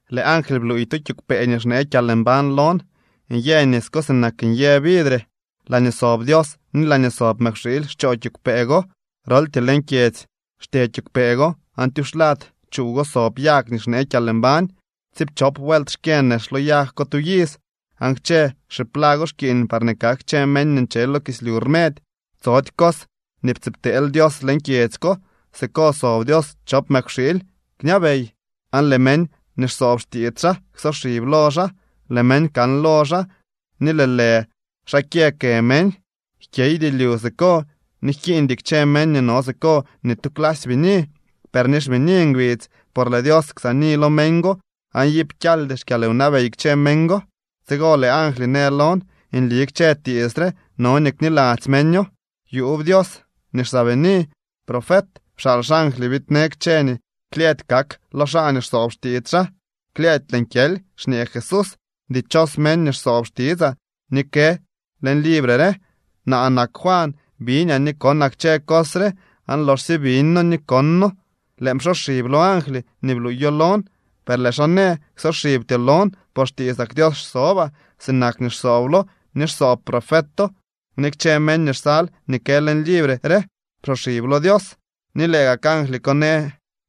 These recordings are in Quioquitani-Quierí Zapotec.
Lëë angly bluuy tu kiigwpee nii xnee kyalmbañ lon. Nyë nis ko sinak nyë vidre. Laañee sob Dios ni laañee sob Mëkwxiily xchoo kiigwpee go. Groltyee leñ kyedzy xtye kiigwpee go aan tyuxlad chuuw go sob yag nii xnee kyalmbañ, tsiipchop vuelt xkyë nex lo yag ko tu iz, aan kchë xiplago xkiiñ parñee kak kchë meñ nii nche lo kislyu rmedy. Tsody cos nii ptsiibteel Dios leñ kyedzy ko. Siko sob Dios chop Mëkwxiily kñabey, aan lëë meñ nii xsoob xtiits xaa ksoxib lo xaa. Lëë meñ kan lo xaa, ni lëë lë xaa kyë kë meñ. Jkyeydy lyu siko ni jkiiñdy kchë meñ nii no siko ni tu clasy bini, per ni xbini ngbidz, por lëë Dios ksaani lo meñ go, aan iip kyaldy xkyalwnabey kchë meñ go. Tsigo lëë angly në lon: —Nli kchë tiits re no nii kniladzy meño. Yuub Dios nii xsaabini profet pxaal xangly biidnee kchë nii klyëëdy kak lo xaa nii xsoob xtiits xaa. —¡Klyëëdy lëën kyely! —xñee Jesús—. ¡Dichos meñ nii xsoob xtitsaa nii kë leñ libre re! Naa nak Juan. Biñaa ni konaa kchë cos re. Aan loxsye biñno ni konno, lëën psoxib lo angly nii bluuyo lon. Per lëë xaa në: —Ksoxibtyoo lon por xtiitsak Dios xsobaa, sinak nii xsooblo ni xsoob profeto ni kchë meñ nii xsal nii kë leñ libre re. Psoxib lo Dios. Ni lëë gak angly ko në: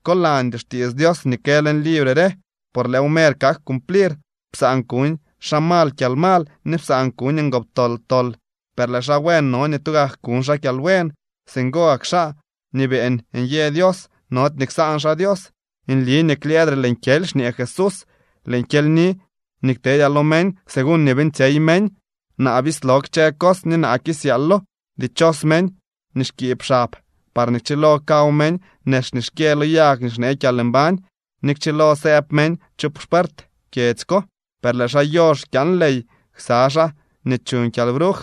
—Kolandyoo xtiits Dios nii kë leñ libre re, por lëëw mer kak cumplir. Psaan kuñ xaa mal kyalmal ni psaan kuñ ngoptol tol, per lëë xaa buen no nii tugak kuñ xaa kyalbuen. Singo gak xaa nii beeñ nyë Dios nody nii ksaan xaa Dios. —Nli nii klyëëdre lëën kyely —xñee Jesús—. Lëën kyelyni nii ktedyaa lo meñ, según nii beeñtsyey meñ. Naa bislo kchë cos ni naa kisyaalo. ’Dichos meñ nii xkiib xab, parñee kchilo kaw meñ nex nii xkyë lo yag nii xnee kyalmbañ, ni kchilo sëëb meñ chu xpuert kyedzy ko. Per lëë xaa yox kyaan ley ksa xaa nii chuuñ kyalbruj,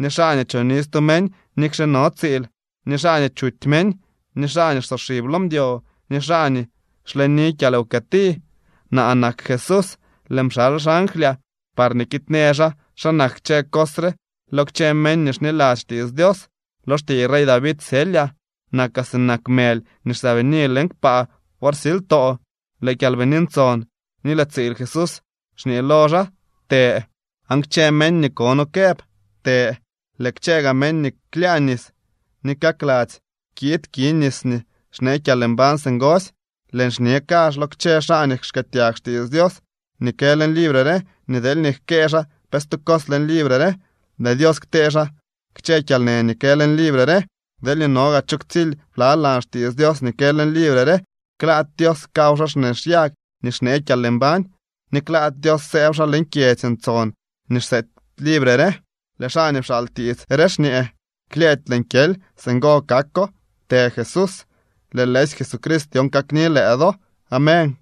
ni xaa nii choni stu meñ nikxe no tsiil, ni xaa nii chuty meñ, ni xaa nii xsoxib lo mdyo, ni xaa nii xleni kyalwkëti. ’Naa nak Jesús. Lëën pxal xanglyaa parñee kiidnee xaa xa nak kchë cos re lo kchë meñ nii xniladzy xtiits Dios. Lo xtiiy rey David syelyaa. Nakaa sinak mëly nii xsaabini leñ kpaa wor silytoo. Lëë Kyalbini Ntson ni lëë tsiil Jesús xñee lo xaa: —Të. Aan kchë meñ nii kono këb: —Të. Lëë kchë gaa meñ nii klyaa nis ni kakladzy kiid ki nis nii xnee kyalmbañ singosy. Lëën xñe kazh lo kchë xaa nii xkëëtyag xtiits Dios nii kë leñ libre re nii deelñee jkëë xaa pe stu cos leñ libre re, lëë Dios ktee xaa kchë kyalnë nii kë leñ libre re. Deelñee no gaa cho ktsily blalan xtiits Dios nii kë leñ libre re, klaady Dios kaw xaa xnex yag nii xnee kyalmbañ ni klaady Dios sëëb xaa leñ kyedzy ntson nii xseety libre re. Lëë xaa nii pxaal tiits re xñee: —Klyëëdy lëën kyely. Singo kako. ¡Të Jesús! Lëë lëësy Jesucrist dyon kakni lëë do. Amén.